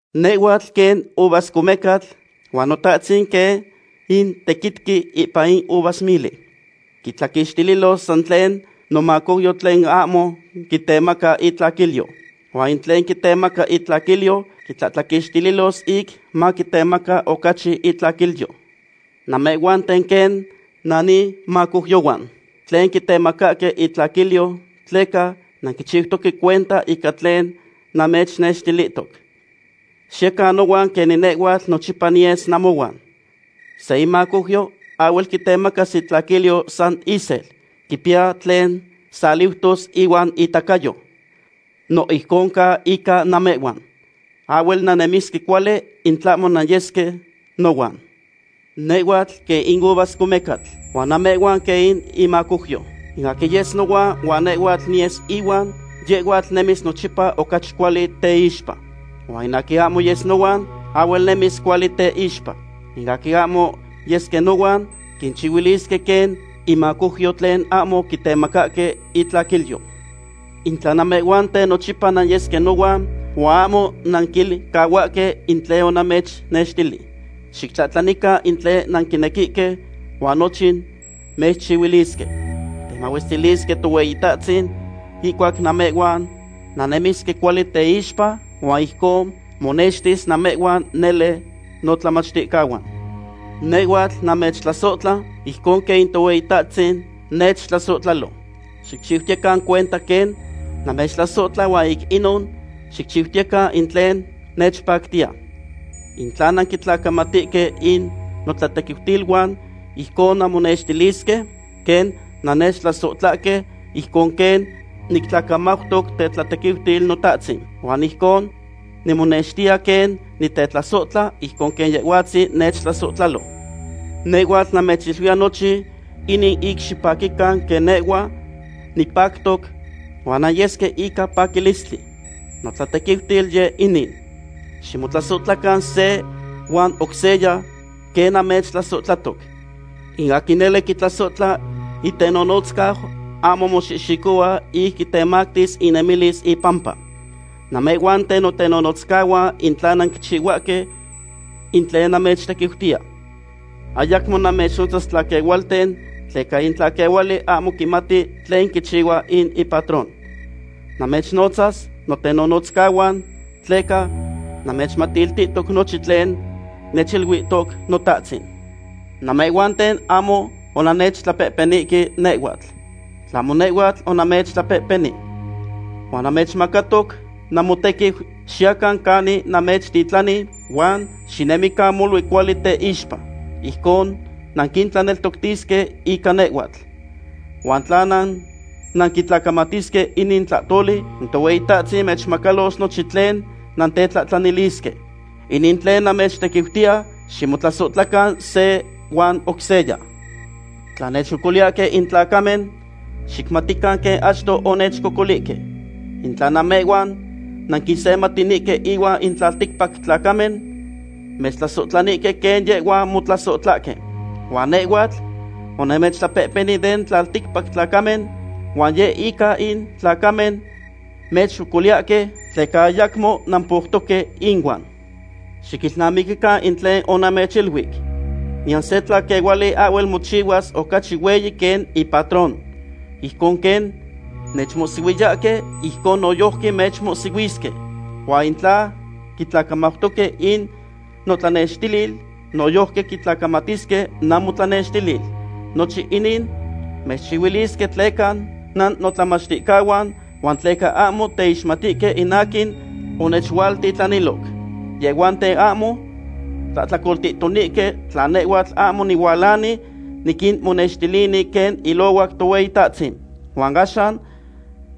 ’Nehhuatl quen uvascomecatl huan Notahtzin quen in tequitqui ipan in uvasmili. Quitlaquixtilos san tlen nomacouyo tlen ahmo quitemaca itlaquilyo. Huan in tlen quitemaca itlaquilyo quitlahtlaquixtilos ic maquitemaca ocachi itlaquilyo. Namehhuanten quen nanimacouyohuan tlen quitemacahque intlaquilyo tleca nanquichiutoque cuenta ica tlen namechnextilihtoc. Xiyecan nohuan quenin nehhuatl nochipa niyes namohuan. Se imacouyo ahhuel quitemacas itlaquilyo san isel. Quipiya tlen saliutos ihuan itacayo. No ijcon ca ica namehhuan. Ahhuel nannemisque cuali in tlahmo nanyesque nohuan. ’Nehhuatl quen in uvascomecatl, huan namehhuan quen in imacouyo. In aquin yes nohuan huan nehhuatl niyes ihuan, yehhuatl nemis nochipa ocachi cuali teixpa. Huan in aquin ahmo yes nohuan, ahhuel nemis cuali teixpa. In aquin ahmo yesque nohuan, quinchihuilisque quen inmacouyo tlen ahmo quitemacahque itlaquilyo. ’In tla namehhuanten nochipa nanyesque nohuan, huan ahmo nanquilcahuahque in tlen onamechnextili, xictlahtlanican in tlen nanquinequihque, huan nochin mechchihuilisque. Temahuestilisque Tohueyitahtzin ihcuac namehhuan nannemisque cuali teixpa huan ijcon monextis namehhuan nele notlamachticahuan. Nehhuatl namechtlasohtla, ijcon quen in Tohueyitahtzin nechtlasohtlalo. Xicchiutiyecan cuenta quen namechtlasohtla huan ic inon xicchiutiyecan in tlen nechpactiya. In tla nanquitlacamatihque in notlatequiutiluan, ijcon nanmonextilisque quen nannechtlasohtlahque, ijcon quen nictlacamautoc tetlatequiutil Notahtzin. Huan ijcon nimonextiya quen nitetlasohtla, ijcon quen Yehhuatzin nechtlasohtlalo. ’Nehhuatl namechiluiya nochin inin ic xipaquican quen nehhua nipactoc, huan nanyesque ica paquilistli. Notlatequiutil yeh inin: ximotlasohtlacan se huan oc seya, quen namechtlasohtlahtoc. In aquin nele quitlasohtla itenonotzcau ahmo moxihxicohua ic quitemactis inemilis ipampa. Namehhuanten notenonotzcahuan in tla nanquichihuahque in tlen namechtequiutiya. Ayacmo namechnotzas tlaquehualten, tleca in tlaquehuali ahmo quimati tlen quichihua in ipatron. Namechnotza notenonotzcahuan, tleca namechmatiltihtoc nochin tlen nechiluihtoc Notahtzin. Namehhuanten ahmo onannechtlapehpenihque nehhuatl, tlahmo nehhuatl onamechtlapehpeni. Huan namechmacatoc namotequiu xiyacan canin namechtitlani huan xinemican molui cuali teixpa. Ijcon nanquintlaneltoctisque ica nehhuatl. Huan tla nanquitlacamatisque inin tlahtoli, in Tohueyitahtzin mechmacalos nochin tlen nantetlahtlanilisque. Inin in tlen namechtequiutiya; ximotlasohtlacan se huan oc seya. ’Tla mechcocoliyahque in tlacamen, xicmatican quen achto onechcocolihque. In tla namehhuan nanquisematinihque inuan in tlalticpac tlacamen, mechtlasohtlanihque quen yehhuan motlasohtlahque. Huan nehhuatl onamechtlapehpeni den tlalticpac tlacamen, huan yeh in ica in tlacamen mechcocoliyahque, tleca ayacmo nampoutoque inuan. Xiquilnamiquican in tlen onamechiluic: “Niyan se tlaquehuali ahhuel mochihuas ocachi hueyi quen ipatron.” Ijcon quen nechmohsihuiyahque, ijcon noyojqui mechmohsihuisque. Huan in tla quitlacamautoque in notlanextilil, noyojqui quitlacamatisque namotlanextilil. Nochin inin mechchihuilisque tleca nannotlamachticahuan, huan tleca ahmo teixmatihque in aquin onechualtitlaniloc. ’Yehhuanten ahmo tlahtlacoltihtonihque tla nehhuatl ahmo nihualani niquinmonextilini quen ilohuac Tohueyitahtzin. Huan axan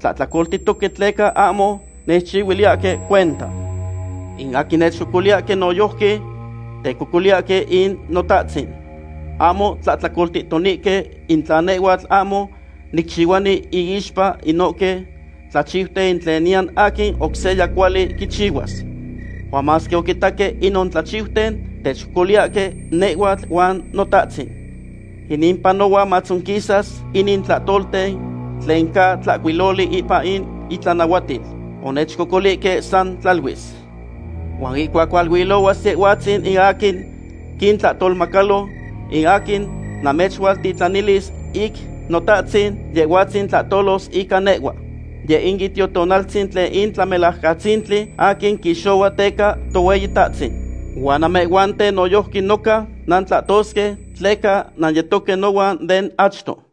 tlahtlacoltihtoque tleca ahmo nechchihuiliyahque cuenta. In aquin nechcocoliyahque noyojqui tecocoliyahque in Notahtzin. Ahmo tlahtlacoltihtonihque in tla nehhuatl ahmo nicchihuani inixpa inohque tlachiuten tlen niyan aquin oc seya cuali quichihuas. Huan masque oquitaque inon tlachiuten, techcocoliyahque nehhuatl huan Notahtzin. Inin panohua matzonquisas inin tlahtolten tlen ca tlahcuiloli ipan intlanahuatil: “Onechcocolihque san tlaluis.” ’Huan ihcuac hualuilohuas Yehhuatzin in aquin quintlahtolmacalo, in aquin namechualtitlanilis ic Notahtzin, Yehhuatzin tlahtolos ica nehhua. Yeh in Itiotonaltzin tlen in Tlamelajcatzintli aquin quixohua teca Tohueyitahtzin. Huan namehhuanten noyojqui noca nantlahtosque, tleca nanyetoque nohuan den achto.